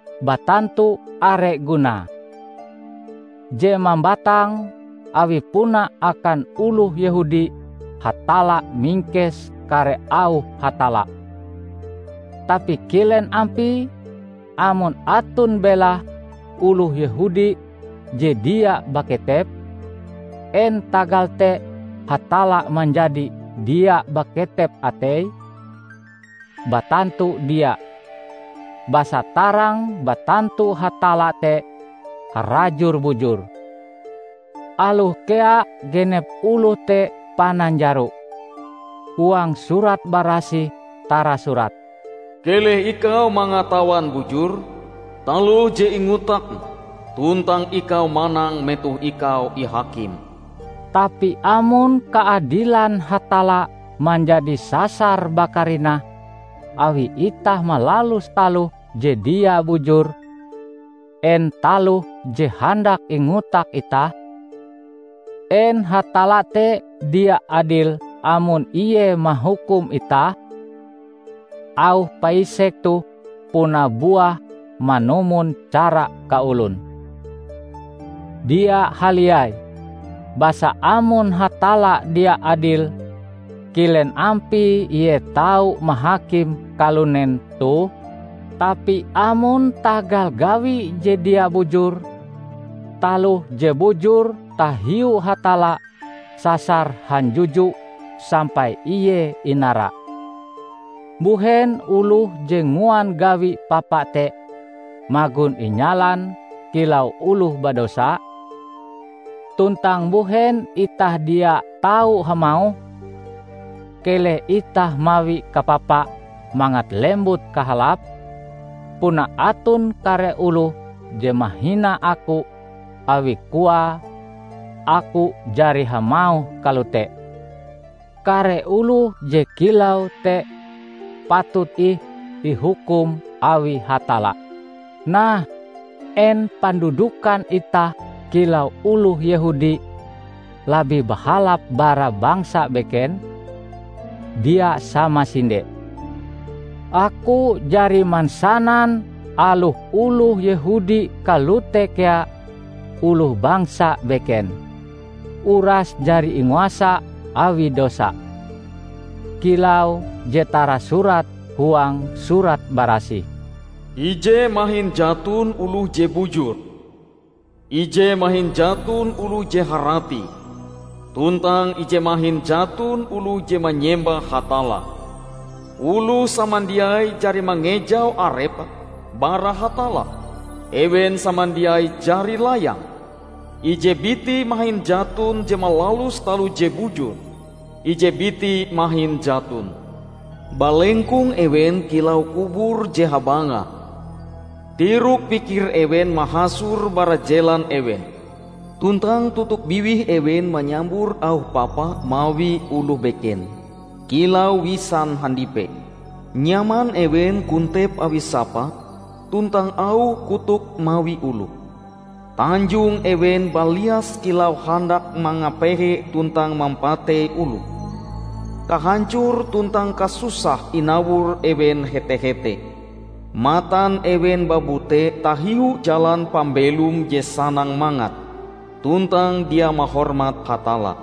Batantu are gunae! Je mambatang, awi puna akan oloh Yehudi Hatalla mingkes kare auh Hatalla. Tapi kilen ampie amon aton belahe oloh Yehudi je dia baketep? En tagal te Hatalla manjadi dia baketep atei? Batantu dia! Basa tarang batantu Hatalla te harajur bujur, aloh kea genep oloh te pananjaro. Huang Surat Barasih tarasurat, "Keleh ikau mangatawan bujur taloh je ingotakm, tuntang ikau manang metoh ikau ihakim." Tapi amon kaadilan Hatalla manjadi sasar bakarinah awi itah malalus taloh je dia bujur, en taloh je handak ingotak itah? En Hatalla te dia adil amon Ie mahukum itah? (Auh paisek toh puna buah manumon cara kaolon.) Dia haliai! Basa amon Hatalla dia adil, kilen ampie Ie tau mahakim kalunen toh? Tapi amon tagal gawi je dia bujur, taloh je bujur tahiu Hatalla sasar hanjuju sampai ie inara, mbuhen oloh je nguan gawi papa te magon inyalan kilau oloh badosa? Tuntang mbuhen itah dia tau hamauh, "Keleh itah mawi kapapa mangat lembut kahalap?" Puna aton kare oloh je mahina aku awi koae aku jari hamauh kalote. Kare oloh je kilau te patut ih ihukum awi Hatalla. Nah, en pandudukan itah kilau oloh Yehudi labih bahalap bara bangsa beken? Dia samasinde! Aku jari mansanan aloh oloh Yehudi kalote kea oloh bangsa beken, uras jari inguasa awi dosa. Kilau je tarasurat huang Surat Barasih, "Ije mahin jaton oloh je bujur, Ije mahin jaton oloh je harati, tuntang ije mahin jaton oloh je manyembah Hatalla. Oloh samandiai jari mangejau arepe bara Hatalla; ewen samandiai jari layang. Ije biti mahin jaton je malalus taloh je bujur; ije biti mahin jaton! Balengkong ewen kilau kubur je habangah. Tirok pikir ewen mahasor bara jelan ewen, tuntang totok biwih ewen manyambur auh papa mawi oloh beken, kilau wisan handipe. Nyaman ewen kontep awi sapa tuntang auh kotok mawi oloh. Tanjong ewen balias kilau handak mangapehe tuntang mampatei oloh. Kahancor tuntang kasusah inawor ewen hete-hete. Matan ewen babute tahiu jalan pambelom je sanang mangat, tuntang dia mahormat Hatalla."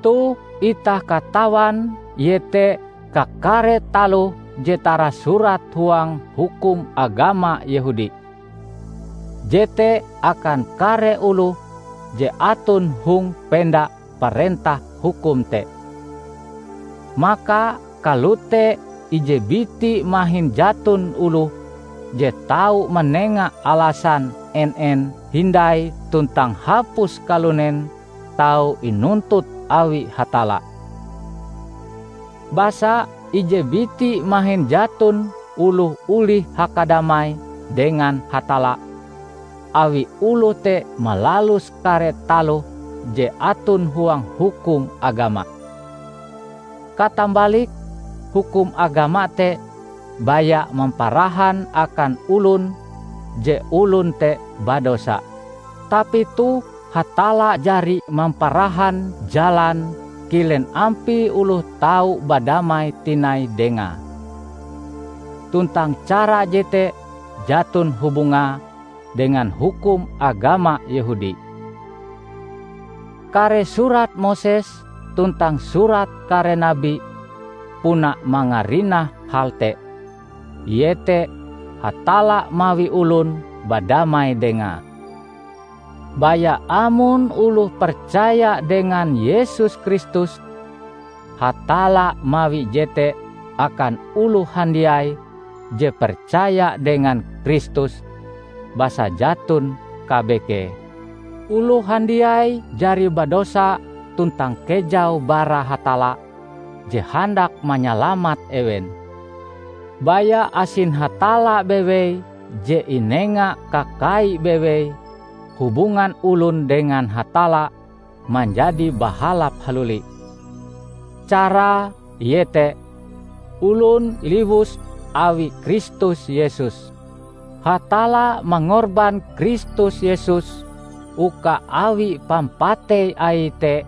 Toh itah katawan iete kakare taloh je tarasurat huang hukum agama Yehudi, jete akan kare oloh je aton hong penda parentah hukum te. Maka kalote ije biti mahin jaton oloh je tau manenga alasan en-en hindai tuntang hapus kalunen tau inuntut awi Hatalla. Basa ije biti mahin jaton oloh olih hakadamai dengan Hatalla awi oloh te malalus kare taloh je aton huang hukum agama. Katambalike, hukum agama te baya mamparahan akan olon je olon te badosa. Tapi toh Hatalla jari mamparahan jalan kilen ampie oloh tau badamai tinai Dengae; tuntang cara jete jaton hubungae dengan hukum agama Yehudi. Kare surat Moses tuntang surat kare nabi puna mangarinah hal te, iete Hatalla mawi olon badamai Dengae, baya amon oloh percaya dengan Yesus Kristus. Hatalla mawi jete akan oloh handiai je percaya dengan Kristus; basa jaton kabekee: Oloh handiai jari badosa tuntang kejau bara Hatalla je handak manyalamat ewen. Baya asin Hatalla bewei je inengae kakai bewei, hubungan olon dengan Hatalla manjadi bahalap haluli; carae iete: olon iliwus awi Kristus Yesus. Hatalla mangorban Kristus Yesus uka awi pampatei Aie te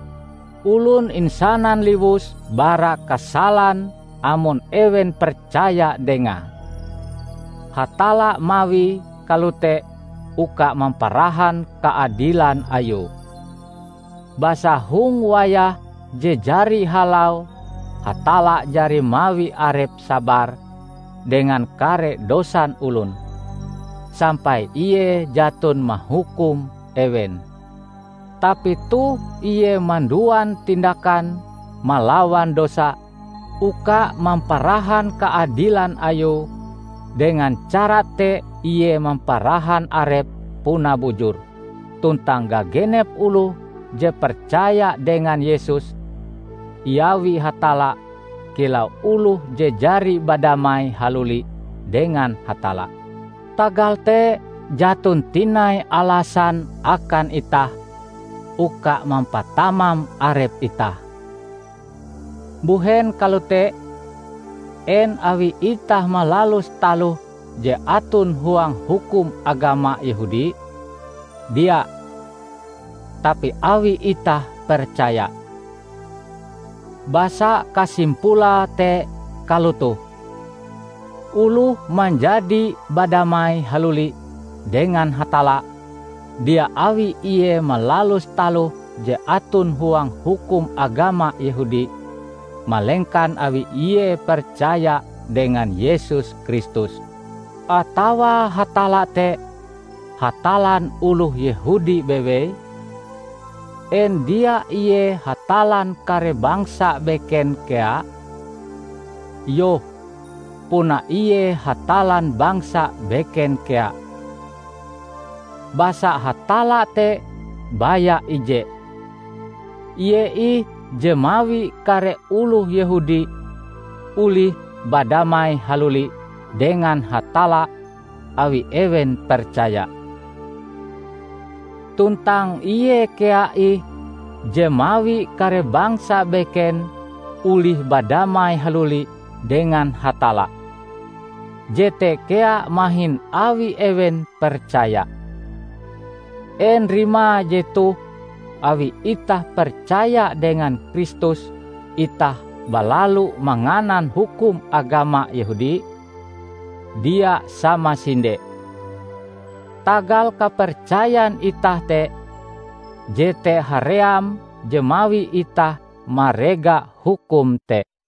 olon insanan liwus bara kasalan amon ewen percaya Dengae. Hatalla mawie kalote uka mamparahan kaadilan Ayue. Basa hong wayah je jari halau Hatalla jari mawi Arepe sabar dengan kare dosan olon, sampai Ie jaton mahukum ewen. Tapi toh Ie manduan tindakan malawan dosa uka mamparahan kaadilan Ayue. Dengan cara te Ie mamparahan Arepe puna bujur; tuntang gagenep oloh je percaya dengan Yesus, iawi Hatalla kilau oloh je jari badamai haluli dengan Hatalla. Tagal te jaton tinai alasan akan itah uka mampatamam arep itah. Mbuhen kalote? En awi itah malalus taloh je aton huang hukum agama Yehudi? Dia. Tapi awi itah percaya. Basa kasimpulae te kalotoh: oloh, manjadi badamai haluli dengan Hatalla, dia awi ie malalus taloh je aton huang hukum agama Yehudi, malengkan awi ie percaya dengan Yesus Kristus. Atawa Hatalla te Hatallan oloh Yehudi bewei? En dia Ie Hatallan kare bangsa beken kea? Iyoh, puna Ie Hatallan bangsa beken kea! Basa Hatalla te baya ije. Ie ih je mawi kare oloh Yehudi olih badamai haluli dengan Hatalla awi ewen percaya. Tuntang Ie kea ih je mawi kare bangsa beken olih badamai haluli dengan Hatalla; jete kea mahin awi ewen percaya. En rimae jetoh awi itah percaya dengan Kristus itah balalu manganan hukum agama Yehudi? Dia sama sinde! Tagal kapercayan itah te, jete haream je mawi itah marega hukum te.